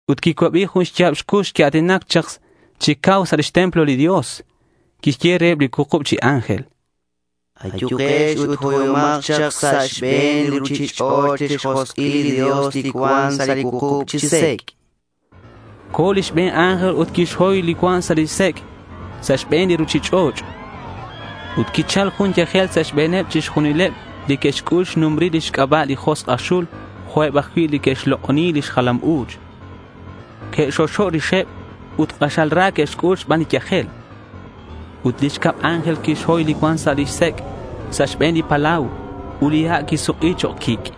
Ut quicuabi jun xya̱b cux quia̱tinac chak chi cau sa' lix templo li Dios. Quixye reheb li cuukub chi ángel: —Ayukex ut hoyomak chak sa' xbe̱n li ruchich'och' lix josk'il li Dios li cuan sa' li cuukub chi sec'.— Co̱ li xbe̱n ángel ut quixhoy li cuan sa' lix sec' sa' xbe̱n li ruchich'och'. Ut quichal jun yajel sa' xbe̱neb chixjunileb li que'xc'ul xnumbril lix c'aba' li josk' aj xul jo'queb ajcui' li que'xlok'oni lix jalam u̱ch. Que'xoxo' rixeb ut k'axal ra que'xc'ul xban li yajel. Ut li xcab ángel quixhoy li cuan sa' lix sec' sa' xbe̱n li palau. Ut li ha' quisuk'i chok' quic'.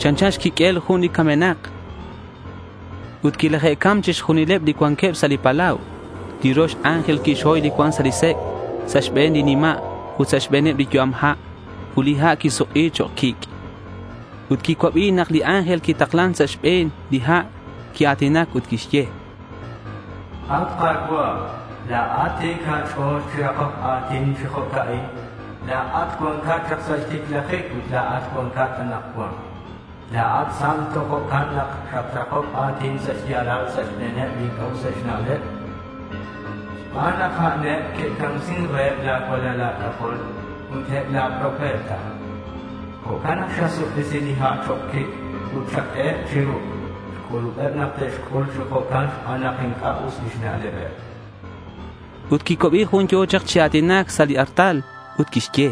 Chanchan xquiq'uel jun camenak. Ut quilaje'cam chixjunileb li cuanqueb sa' li palau. Li rox ángel quixhoy li cuan sa' lix sec' sa' xbe̱neb li nima' ut sa' xbe̱neb li yu'am ha'. Ut li ha' quisuk'i chok' quic'. Ut quicuabi nak li ángel li nataklan sa' xbe̱n li ha' quia̱tinac ut quixye: —At Ka̱cua', la̱at ti̱c a̱ch'o̱l chi rakoc a̱tin chi jo'ca'in. La̱at ac cuancat chak sa' xticlajic ut la̱at cuancat anakcuan. La̱at santo. Jo'can nak xatrakoc a̱tin sa' xya̱lal sa' xbe̱neb li inc'a' useb xna'leb. Xban nak a'an eb que'camsin reheb la̱ cualal a̱c'ajol ut eb la̱ profeta, jo'can nak xasuk'isi li ha' chok' quic' ut xaq'ueheb chiruc'. Xc'ulubeb nak te'xc'ul chi jo'can xban nak inc'a' us lix na'lebeb, chan. Ut quicuabi jun yo̱ chak chi a̱tinac sa' li artal. Ut quixye: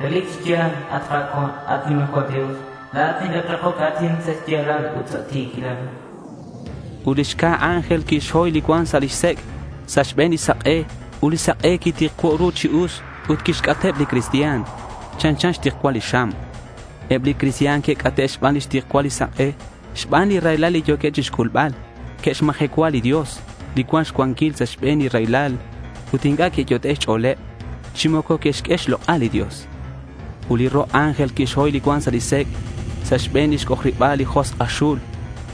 —Relic chi ya̱l, at Ka̱cua', at nimajcual Dios, La̱at nacatrakoc a̱tin sa' xya̱lal ut sa' ti̱quilal, chan. Ut li xca̱ ángel quixhoy li cuan sa' lix sec' sa' xbe̱n li sak'e. Ut li sak'e quitikcuo' ru chi us ut quixc'ateb li cristian. Chanchan xtikcual li xam. Eb li cristian que'c'ate' xban xtikcual li sak'e. Xban li raylal li yo̱queb chixc'ulbal, que'xmajecua li Dios li cuan xcuanquil sa' xbe̱neb li raylal. Ut inc'a' que'yot'e' xch'o̱leb chi moco que'xq'ue xlok'al li Dios. Ut li ro' ángel quixhoy li cuan sa' lix sec' sa' xbe̱n lix c'ojariba̱l li josk' aj xul.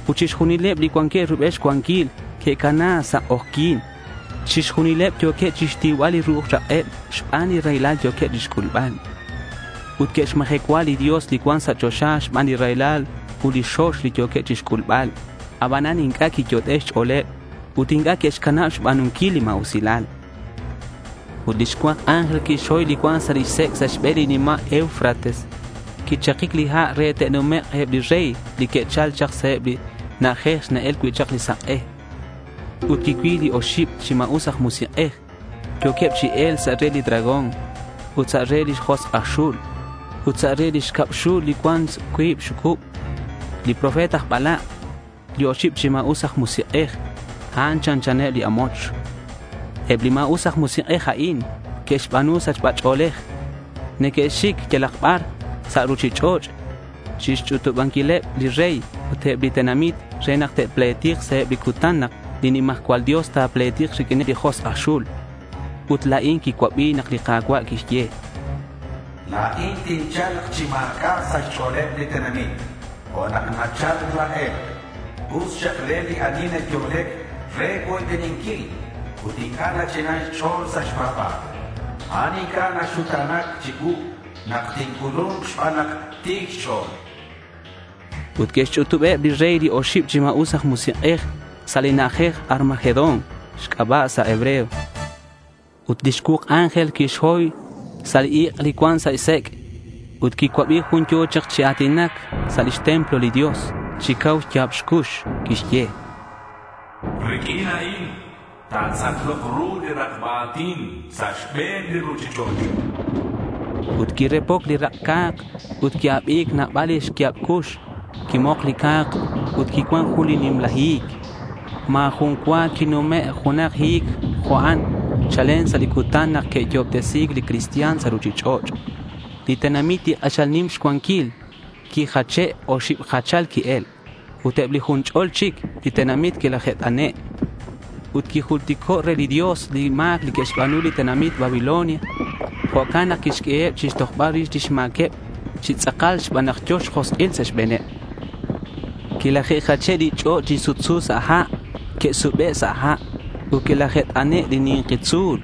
Ut chixjunileb li cuanqueb rubel xcuanquil que'cana sa' k'ojyi̱n. Chixjunileb yo̱queb chixtiubal li ru'uj rak'eb xban li raylal yo̱queb chixc'ulbal. Ut que'xmajecua li Dios li cuan sa' choxa xban li raylal ut li xox li yo̱queb chixc'ulbal. Abanan inc'a' quiyot'e' xch'o̱leb ut inc'a' que'xcanab xba̱nunquil li ma̱usilal. Ut li xcuak ángel quixhoy li cuan sa' lix sec' sa' xbe̱n li nima' Eufrates. Quichakic li ha' re te'numek' eb li rey li que'chal chak sa' eb li na'ajej li na-el cui' chak li sak'e. Ut quicuil oxib li ma̱us aj musik'ej. Yo̱queb chi e̱lc sa' re li dragón ut sa' re li josk' aj xul ut sa' re li xcab xul li cuan cuib xxucub, li profeta aj balak'. Li oxib chi ma̱us aj musik'ej, a'an chanchaneb li amoch. Eb li ma̱us aj musik'ej a'in neque'xba̱nu sachba ch'o̱lej. Neque'xic yalak bar sa' ruchich'och' chixch'utubanquileb li rey ut eb li tenamit re nak te'pletik sa' eb li cutan nak li nimajcual Dios ta̱pletik riq'uin li josk' aj xul. Ut la̱in quicuabi nak li Ka̱cua' quixye: —La̱in tincha̱lk chi ma̱c'a' sa' xch'o̱leb li tenamit jo' nak nachal laj e̱lk'. Us xak re li ani nayo'lec re cuoybeninquil ut inc'a' nach'inan xch'o̱l sa' xpa̱ba̱l. A'an inc'a' ta̱xuta̱na̱k chicuu nak tinc'ulu̱nk xban nak ti̱c xch'o̱l, chan. Ut que'xch'utub eb li rey li oxib chi ma̱us aj musik'ej sa' li na'ajej Armagedón xc'aba' sa' hebreo. Ut lix cuuk ángel quixhoy sa' ik' li cuan sa' lix sec'. Ut quicuabi jun yo̱ chak chi a̱tinac sa' lix templo li Dios. Chi cau xya̱b xcux quixye: —Riq'uin a'in ta̱tz'aklok ru li rakba a̱tin sa' xbe̱n li ruchich'och'.— Ut quirepoc li rak' ca̱k ut qui-abi̱c nabal li xya̱b cux. Quimok li ca̱k. Ut quicuan jun nimla hi̱c. Ma̱ jun cua quinume' junak hi̱c jo' a'an chalen sa' li cutan nak que'yo'obtesi̱c li cristian sa' ruchich'och'. Li tenamit li k'axal nim xcuanquil quijache'. Oxib jachal qui-el. Ut eb li jun ch'ol chic tenamit quilaje't'ane'. Ut quijultico' re li Dios li ma̱c que'xba̱nu li tenamit Babilonia. Jo'can nak quixq'ueheb chixtojbal rix lix ma̱queb chi tz'akal xban nak yo̱ xjosk'il sa' xbe̱neb. Quilaje'sache' li ch'och' li sutsu sa' ha'. Que'sube' sa' ha'. Ut quilaje't'ane' li ni̱nki tzu̱l.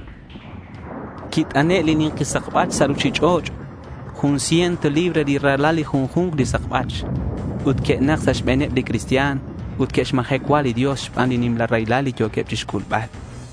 Quit'ane' ni̱nki sakbach sa' ruchich'och'. Ju̱nk ciento libra ra̱lal li junju̱nk chi sakbach. Ut que'nak sa' xbe̱neb li cristian ut que'xmajecua li Dios xban li nimla raylal li yo̱queb chixc'ulbal.